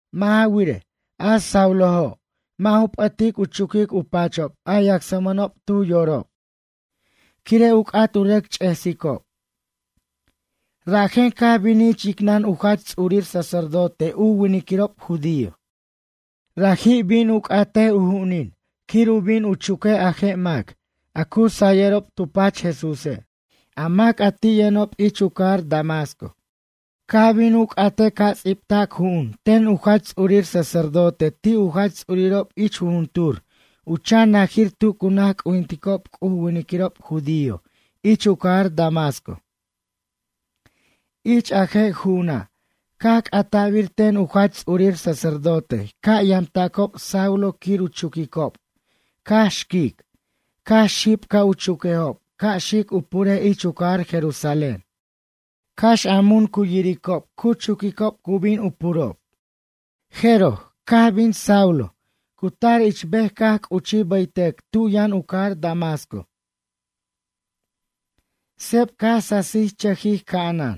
Mʌ' ja wirej, a Saulo' mʌ' ju p'ʌtic u chuquic u pachob a yacsmʌnob tu yorob, quire' u c'at u rʌc ch'esicob. Rajen caj binij ich yicnʌn u jach ts'urir sacerdote u winiquirob judío. Raji' bin u c'atej u ju'unin quir u bin u chuquej a je' mac a cu sayʌrob tu pach Jesúse', a mac a ti' yʌnob ich u cajar Damasco. Caj bin u c'atej ca' ts'ibtac ju'un ten u jach ts'urir sacerdote ti' u jach ts'urirob ich jujuntur u chan najir tu cu naj c'ujinticob C'uj u winiquirob judío ich u cajar Damasco. Ich a je' ju'una' caj c'ata'bir ten u jach ts'urir sacerdote ca' yamtacob Saulo quir u chuquicob, cax xquic, cax xib ca' u chuquejob ca' xic u purej ich u cajar Jerusalén. Cax a mun cu yiricob cu chuquicob cu bin u purob. Jeroj, caj bin Saulo, cu tar ich bej caj c'uchij bʌytʌc tu yʌn u cajar Damasco. Seb caj sasichʌjij ca'anan.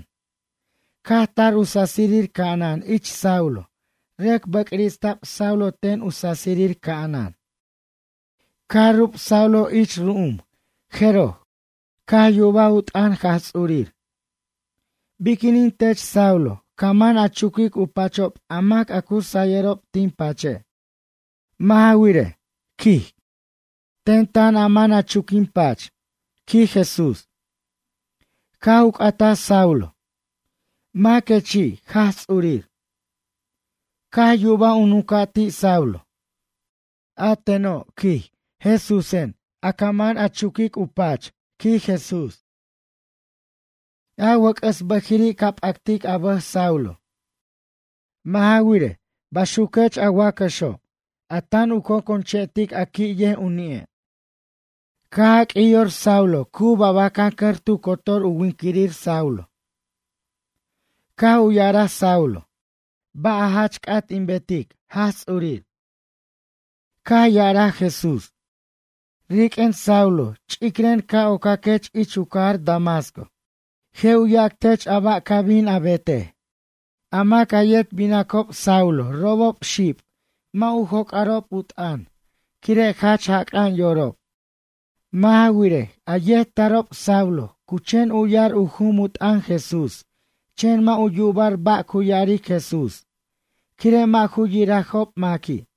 Caj tar u sasir ca'anan ich Saulo, rʌc bʌcrista'b Saulo ten u sasir ca'anan. Caj rub Saulo ich ru'um jeroj, caj yubaj u t'ʌn Jaj Ts'urir: ―Biquinin tech Saulo, ca man a chuquic u pachob a mac a cu sayʌrob tin pache'? Mʌ' ja wirej ―quij―, ten tan a man a chuc quin pach ―quij Jesús. Caj u c'ataj Saulo: ―Maquechi', Jaj Ts'urir? Caj yubaj u nunca' ti' Saulo: ―A teno' ―quij―, Jesúsen, a maca' ca man a chuquicob ten ―quij Jesús. A wʌc'ʌs bʌjiri' ca p'actic a bʌj Saulo. Mʌ' ja wirej, baxuquech a wacʌxo', a tan u conconch'ʌctic a qui' yej u ni'e'. Caj jaq'uij yor Saulo cu babacancʌr tu cotor u winquirir Saulo. Caj u ya'araj Saulo: ―Ba' a jach c'at in betech, Jaj Ts'urir? Caj ya'araj Jesús: ―Riq'uen, Saulo ch'icren, ca' ocaquech ich u cajar Damasco. Je' u yac tech a ba' ca bin a betej. A mac a yet binacob Saulo, robob xib, mʌ' u joc'arob u t'ʌn, quire' jach jac'a'an yorob. Mʌ' ja wirej, a yet tarob Saulo, cu chen u'ya'r u jum u t'ʌn Jesús, chen mʌ' u yuba'r ba' cu ya'aric Jesús, quire' mʌ' ju yirajob maqui'.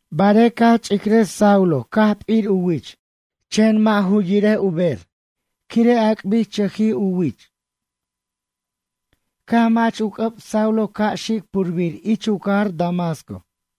Barej caj ch'icraj Saulo caj p'ir u wich, chen mʌ' u yir u ber, quire' ac'bichʌj u wich. Caj mach u c'ʌb Saulo ca' xic purbir ich u cajar Damasco.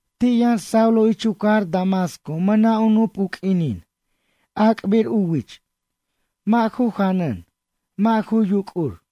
Ti' yʌn Saulo ich u cajar Damasco mʌna' u nup u q'uinin, ac'bir u wich, mʌ' ju janan, mʌ' ju yuc'ur.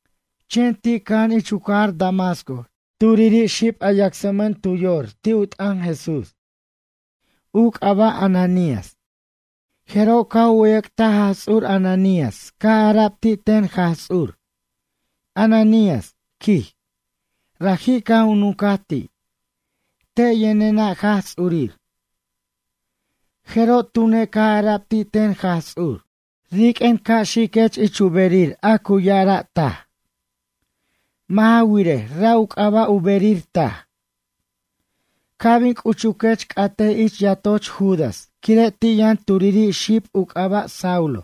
Chen ti' cʌja'an ich u cajar Damasco turiri xib a yacsmʌn tu yor ti' u t'ʌn Jesús. U c'aba' Ananías. Jeroj caj u wʌyʌc'taj Jaj Ts'ur, Ananías caj ara'b ti' ten Jaj Ts'ur: ―Ananías ―quij. Raji' caj u nuncaj ti': ―Te' yʌnena', Jaj Ts'urir. Jeroj tune', caj ara'b ti' ten Jaj Ts'ur: ―Riq'uen ca' xiquech ich u berir a cu ya'ara' Taj. Mʌ' ja wirej, ra' u c'aba' u berir taj. Ca' bin c'uchuquech, c'atej ich yatoch Judas, quire' ti' yʌn turiri' xib, u c'aba' Saulo,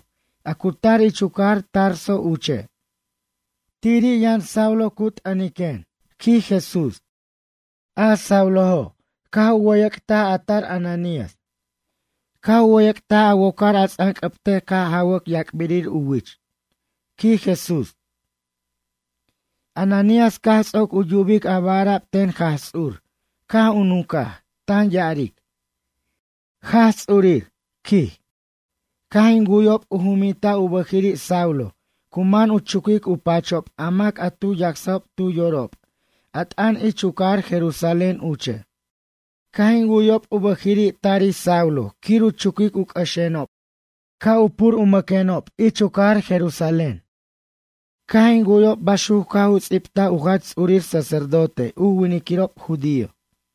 a cu tar ich u cajar Tarso uche'. Tiri' yʌn Saulo cu t'ʌniquen ―quij Jesús. A Saulo', caj u wʌyʌc'taj a tar Ananías. Caj u wʌyʌc'taj a wocar a ts'anc'ʌbtej ca' jawʌc u yac'birir u wich ―quij Jesús. Ananías caj ts'oc u yubic a ba' ara'b ten Jaj Ts'ur, caj u nuncaj, tan ya'aric: ―Jaj Ts'urir ―quij―, caj in wu'yob u juminta' u bʌjiri' Saulo cu man u chuquic u pachob a mac a tu yacsajob tu yorob a t'ʌn ich u cajar Jerusalén uche'. Caj in wu'yob u bʌjiri' tarij Saulo quir u chuquic u c'ʌxenob, ca' u pur u maquenob ich u cajar Jerusalén. Caj in wu'yob baxuc caj u ts'ibtaj u jach ts'urir sacerdote u winiquirob judío.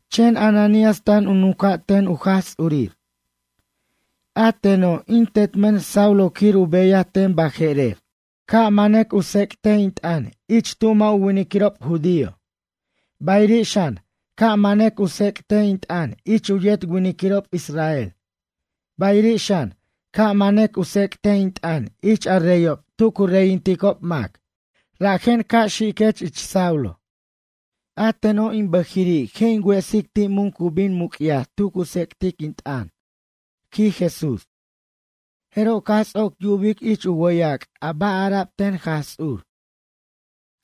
Chen Ananías tan u nunca' ten u Jaj Ts'urir. ―A teno', in tetmʌn Saulo quir u beyaj ten baje'rer. Ca' manʌc u tsec't in t'ʌn ich tu mʌ' u winiquirob judío, bayiri' xan, ca' manʌc u tsec't in t'ʌn ich u yet winiquirob israel, bayiri' xan, ca' manʌc u tsec't in t'ʌn ich a reyob tu cu reyinticob mac, rajen ca' xiquech ich Saulo. A teno', in bʌjiri' je' in wesic ti' mun cu bin muc'yaj tu cu tsec'tic in t'ʌn ―quij Jesús. Jeroj caj ts'oc yubic ich u wʌyac' a ba' ara'b ten Jaj Ts'ur,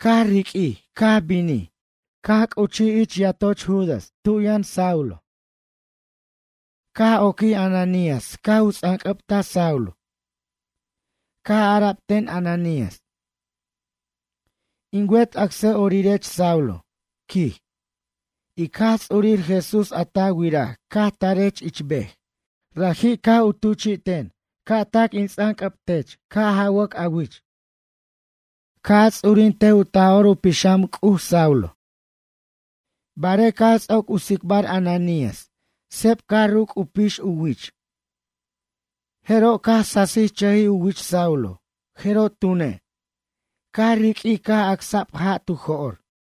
caj riq'uij caj binij, caj c'uchij yatoch Judas tu yʌn Saulo. Caj oquij Ananías caj u ts'anc'ʌbta Saulo. Caj ara'b ten Ananías: ―In wet acsa'orirech Saulo ―quij―. Ic Jaj Ts'urir Jesús a ta wiraj caj tarech ich bej, raji' caj u tuchi'ten ca' tac in ts'anc'ʌbtech ca' jawʌc a wich. Ca' a ts'urintej u Taj'or u Pixam C'uj, Saulo. Barej caj ts'oc u tsicbar Ananías, seb caj ruc' u pix u wich, jeroj caj sasichʌjij u wich Saulo, jeroj tune', caj riq'uij caj acsa'b ja' tu jo'r.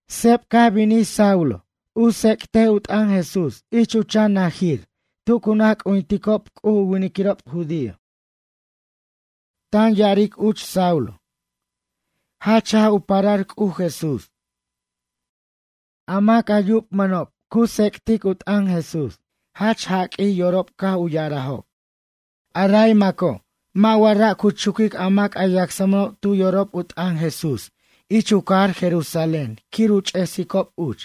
Seb Saulo caj bin u tsec'tic u t'ʌn Jesús ich u chan najir tu cu naj c'ujinticob C'uj u winiquirob judío. Tan ya'aric uch Saulo: “Jach jaj u parar C'uj Jesús.” A mac a yubmʌnob cu tsec'tic u t'ʌn Jesús, jach jaq'uij yorob caj u ya'arajob: ―A ray maco', mʌ' wa ra' cu chuquic a mac a yacsmʌnob tu yorob u t'ʌn Jesús ich u cajar Jerusalén quir u ch'esicob uch?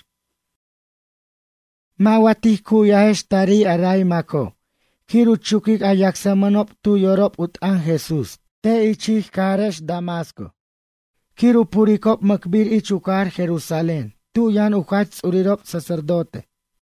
Mʌ' wa tij cu'yajex tarij a ray maco', quir u chuquic a yacsmʌnob tu yorob u t'ʌn Jesús te' ich ij cajarex Damasco, quir u puricob mʌcbir ich u cajar Jerusalén, tu yʌn u jach ts'urirob sacerdote?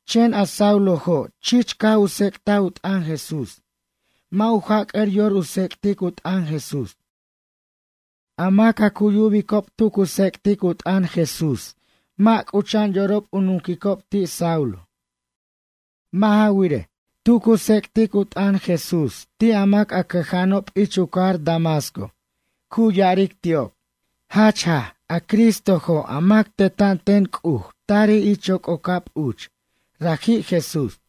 Chen a Saulojo', chich caj u tsec'taj u t'ʌn Jesús, mʌ' u jac'ʌr yor u tsec'tic u t'ʌn Jesús. A mac a cu yubicob tu cu tsec'tic u t'ʌn Jesús, mʌ' c'ucha'an yorob u nunquicob ti' Saulo. Mʌ' ja wirej, tu cu tsec'tic u t'ʌn Jesús ti' a mac cʌja'anob ich u cajar Damasco, cu ya'aric ti'ob: ―Jach jaj, a Cristojo' a mac teta'an ten C'uj tarij ich yoc'ocab uch, raji' Jesús.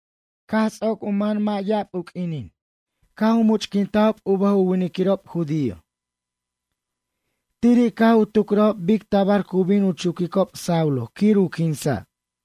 Caj ts'oc u man mʌ' ya'ab u q'uinin, caj u much'quintajob u bʌj u winiquirob judío. Tiri' caj u tucrajob bic tabar cu bin u chuquicob Saulo quir u quinsa'.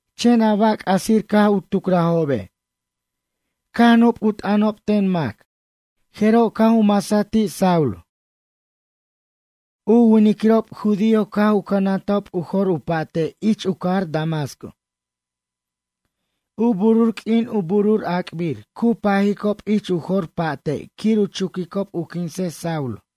Chen a ba' c'asir caj u tucrajobe', caj nup u t'ʌnob ten mac, jeroj caj u masaj ti' Saulo. U winiquirob judío caj u cʌnantob u jor u pa'te' ich u cajar Damasco. U burur q'uin u burur ac'bir cu pajicob ich u jor pa'te' quir u chuquicob u quinsej Saulo.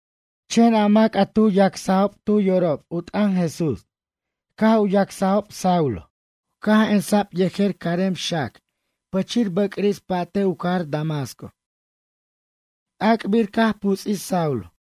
Chen a mac a tu yacsajob tu yorob u t'ʌn Jesús, caj u yacsajob Saulo, caj emsa'b yejer carem xac pichir bʌcris pa'te' u cajar Damasco. Ac'bir caj puts'ij Saulo.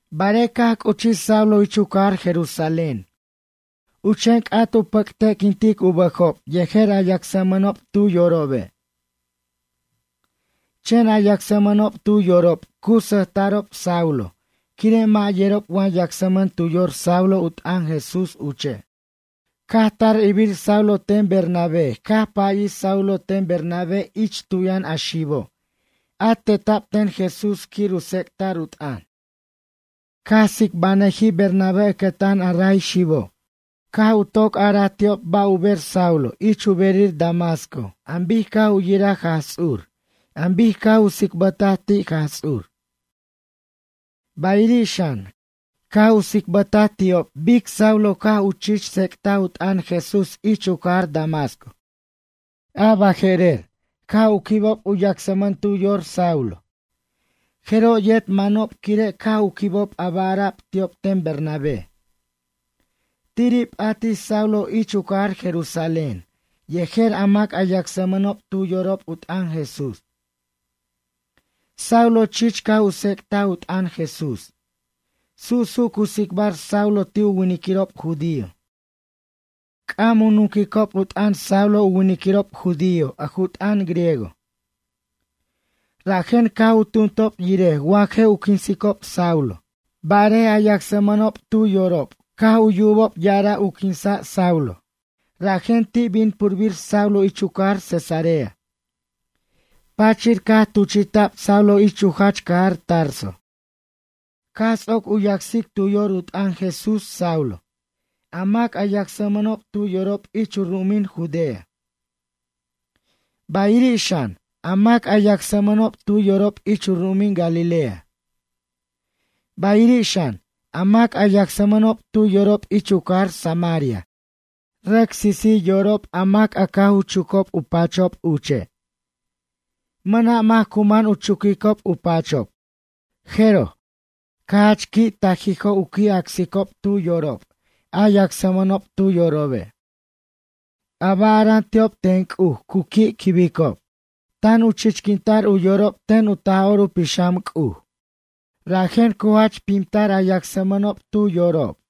Barej caj c'uchij Saulo ich u cajar Jerusalén, cu chen c'at u pʌcte'quintic u bʌjob yejer a yacsmʌnob tu yorobe'. Chen a yacsmʌnob tu yorob cu sʌjta'rob Saulo quire' mʌ' yerob wa yacsmʌn tu yor Saulo u t'ʌn Jesús uche'. Caj tar irbir Saulo ten Bernabé, caj payij Saulo ten Bernabé ich tu yʌn a xibo' a teta'b ten Jesús quir u tsec'ta'r u t'ʌn. Caj tsicbanʌjij Bernabé ʌcʌtan a ray xibo', caj u toc araj ti'ob ba' u ber Saulo ich u berir Damasco an bic caj u yiraj Jaj Ts'ur, an bic caj u tsicbʌtaj ti' Jaj Ts'ur. Bayiri' xan, caj u tsicbʌtaj ti'ob bic Saulo caj u chich tsec'taj u t'ʌn Jesús ich u cajar Damasco. A baje'rer caj u quibob u yacsmʌn tu yor Saulo. Jeroj yet manob, quire' caj u quibob a ba' ara'b ti'ob ten Bernabé. Tiri' p'atij Saulo ich u cajar Jerusalén yejer a mac a yacsmʌnob tu yorob u t'ʌn Jesús. Saulo chich caj u tsec'taj u t'ʌn Jesús. Su'su' cu tsicbar Saulo ti' u winiquirob judío. C'am u nunquirob u t'ʌn Saulo u winiquirob judío a ju t'ʌn griego. Rajen caj u tumtob yirej wa je' u quinsicob Saulo. Barej a yacsmʌnob caj u yorob tu yubob ya'ara' u quinsa' Saulo, rajen ti' bin purbir Saulo ich u cajar Cesarea, pachir caj tuchi'ta'b Saulo ich u jach cajar Tarso. Caj ts'oc u yacsic tu yor u t'ʌn Jesús, Saulo, a mac a yacsmʌnob tu yorob ich u ru'umin Judea, bayiri' xan, a mac a yacsmʌnob tu yorob ich u ru'umin Galilea, bayiri' xan, a mac a yacsmʌnob tu yorob ich u cajar Samaria, rʌc sisij yorob a mac a caj u chucob u pachob uche', mʌna' mac cu man u chuquicob u pachob. Jeroj, caj jach qui' tajijo' u qui' acsicob tu yorob a yacsmʌnob tu yorobe'. A ba' ara'an ti'ob ten C'uj cu qui'qui'quibicob. Tan u chichquinta'r u yorob ten u Taj'or u Pixam C'uj, rajen cu jach pimtar a yacsmʌnob tu yorob.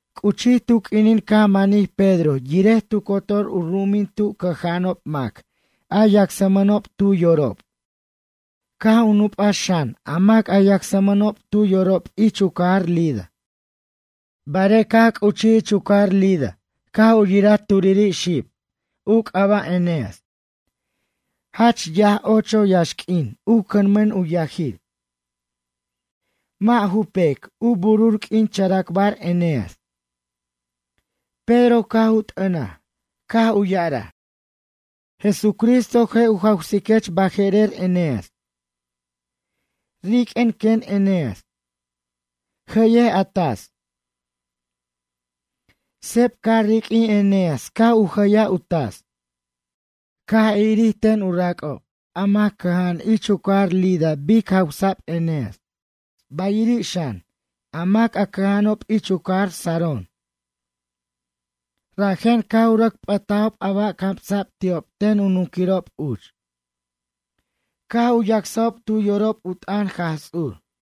C'uchij tu q'uinin caj manij Pedro yirej tu cotor u ru'umin tu cʌja'anob mac a yacsmʌnob tu yorob, caj u nupaj xan, a mac a yacsmʌnob tu yorob ich u cajar Lida. Barej caj c'uchij ich u cajar Lida caj u yiraj turiri' xib. U c'aba' Eneas. Jach yaj, ocho yaxq'uin u cʌnmʌn u yajir, mʌ' ju pec, u burur q'uin characbar Eneas. Pedro caj u t'ʌnaj, caj u ya'araj: ―Jesucristo je' u jawsiquech baje'rer, Eneas. Riq'uen, quen Eneas. Jʌyej a tas. Seb caj riq'uij Eneas caj u jʌyaj u tas. Caj irir ten u rac'ob, a mac cʌja'an ich u cajar Lida bic jawsa'b Eneas, bayiri' xan, a mac a cʌja'anob ich u cajar Sarón, rajen caj u rʌc p'ʌtajob a ba' camsa'b ti'ob ten u nunquirob uch, caj u yacsajob tu yorob u t'ʌn Jaj Ts'ur.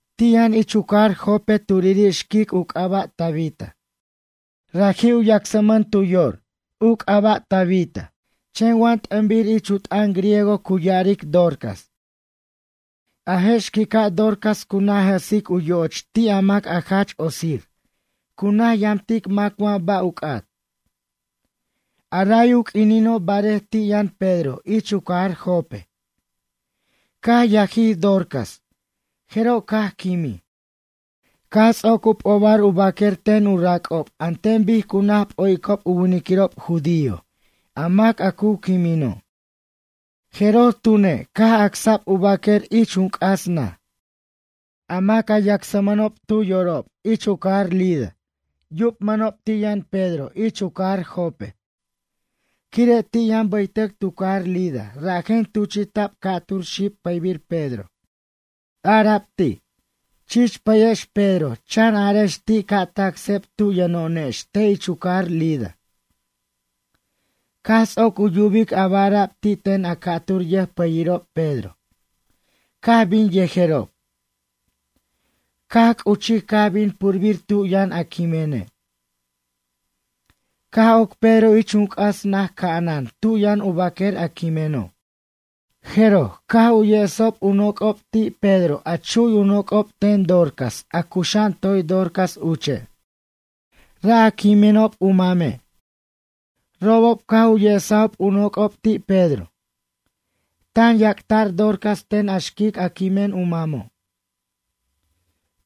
Ti' yʌn ich u cajar Jope turiri' xquic u c'aba' Tabita. Raji' u yacsmʌn tu yor. U c'aba' Tabita chen wa t'ʌnbir ich u t'ʌn griego cu ya'aric Dorcas. A je' xquica' Dorcas cu naj jʌsic u yo'och ti' a mac a jach otsir, cu naj yamtic mac wa ba' u c'at. A ray u q'uinino', barej ti' yʌn Pedro ich u cajar Jope, caj yajij Dorcas, jeroj caj quimij. Caj ts'oc u p'obar u baquer ten u rac'ob, an ten bic cu naj p'o'icob u winiquirob judío a mac a cu quimino'. Jeroj tune', caj acsa'b u baquer ich jun c'as naj. A mac a yacsmʌnob tu yorob ich u cajar Lida yubmʌnob ti' yʌn Pedro ich u cajar Jope, quire' ti' yʌn bʌytʌc tu cajar Lida, rajen tuchi'ta'b ca'tur xib pʌybir Pedro. Ara'b ti': ―Chich pʌyex Pedro, chan arex ti' ca' tac seb tu yʌno'onex te' ich u cajar Lida. Caj ts'oc u yubic a ba' ara'b ti' ten a ca'tur yʌjpʌyirob Pedro, caj bin yejerob. Caj c'uchij, caj bin purbir tu yʌn a quimene'. Caj oc Pedro ich jun c'as naj ca'anan tu yʌn u baquer a quimeno'. Jeroj, caj u yesob u noc'ob ti' Pedro a chu'y u noc'ob ten Dorcas, a cuxa'an toy Dorcas uche'. Ra' a quiminob u mame', robob caj u yesajob u noc'ob ti' Pedro. Tan yac'ata'r Dorcas ten a xquico' a quimen u mamo'.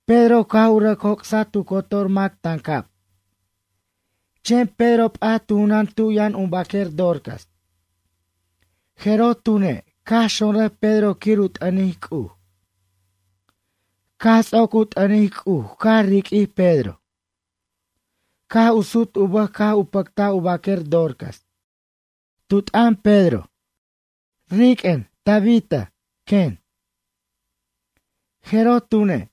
Pedro caj u rʌc joc'saj tu cotor mac tancab, chen Pedro p'at tu junan tu yʌn u baquer Dorcas. Jeroj tune', caj xonrʌj Pedro quir u t'ʌnic C'uj. Caj ts'oc u t'ʌnic C'uj, caj riq'uij Pedro. Caj u sut u bʌj caj u pʌctaj u baquer Dorcas. Tu t'ʌn Pedro: ―Riq'uen, Tabita, quen. Jeroj tune',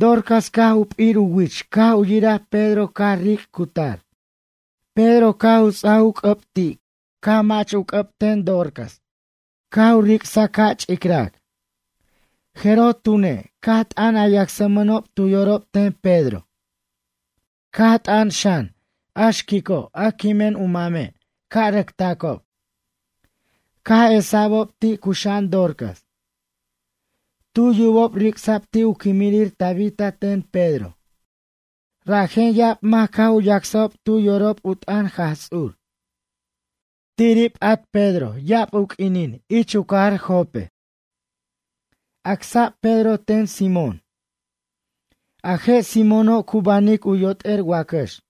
Dorcas caj u p'ir u wich, caj u yiraj Pedro, caj ric' cutar. Pedro caj u ts'aj u c'ʌb ti', caj mach u c'ʌb ten Dorcas, caj u ric'saj ca' ch'icrar. Jeroj tune', caj t'an a yacsmʌnob tu yorob ten Pedro. Caj t'an xan a xquico' a quimen u mame' ca' rʌc tacob. Caj esa'bob ti', cuxa'an Dorcas. Tu yubob ric'sa'b ti' u quimirir Tabita ten Pedro, rajen ya'ab mac caj u yacsob tu yorob u t'ʌn Jaj Ts'ur. Tiri' p'at ya'ab u q'uinin Pedro ich u cajar Jope. Acsa'b Pedro ten Simón. A je' Simóno' cu banic u yot'er wacʌx.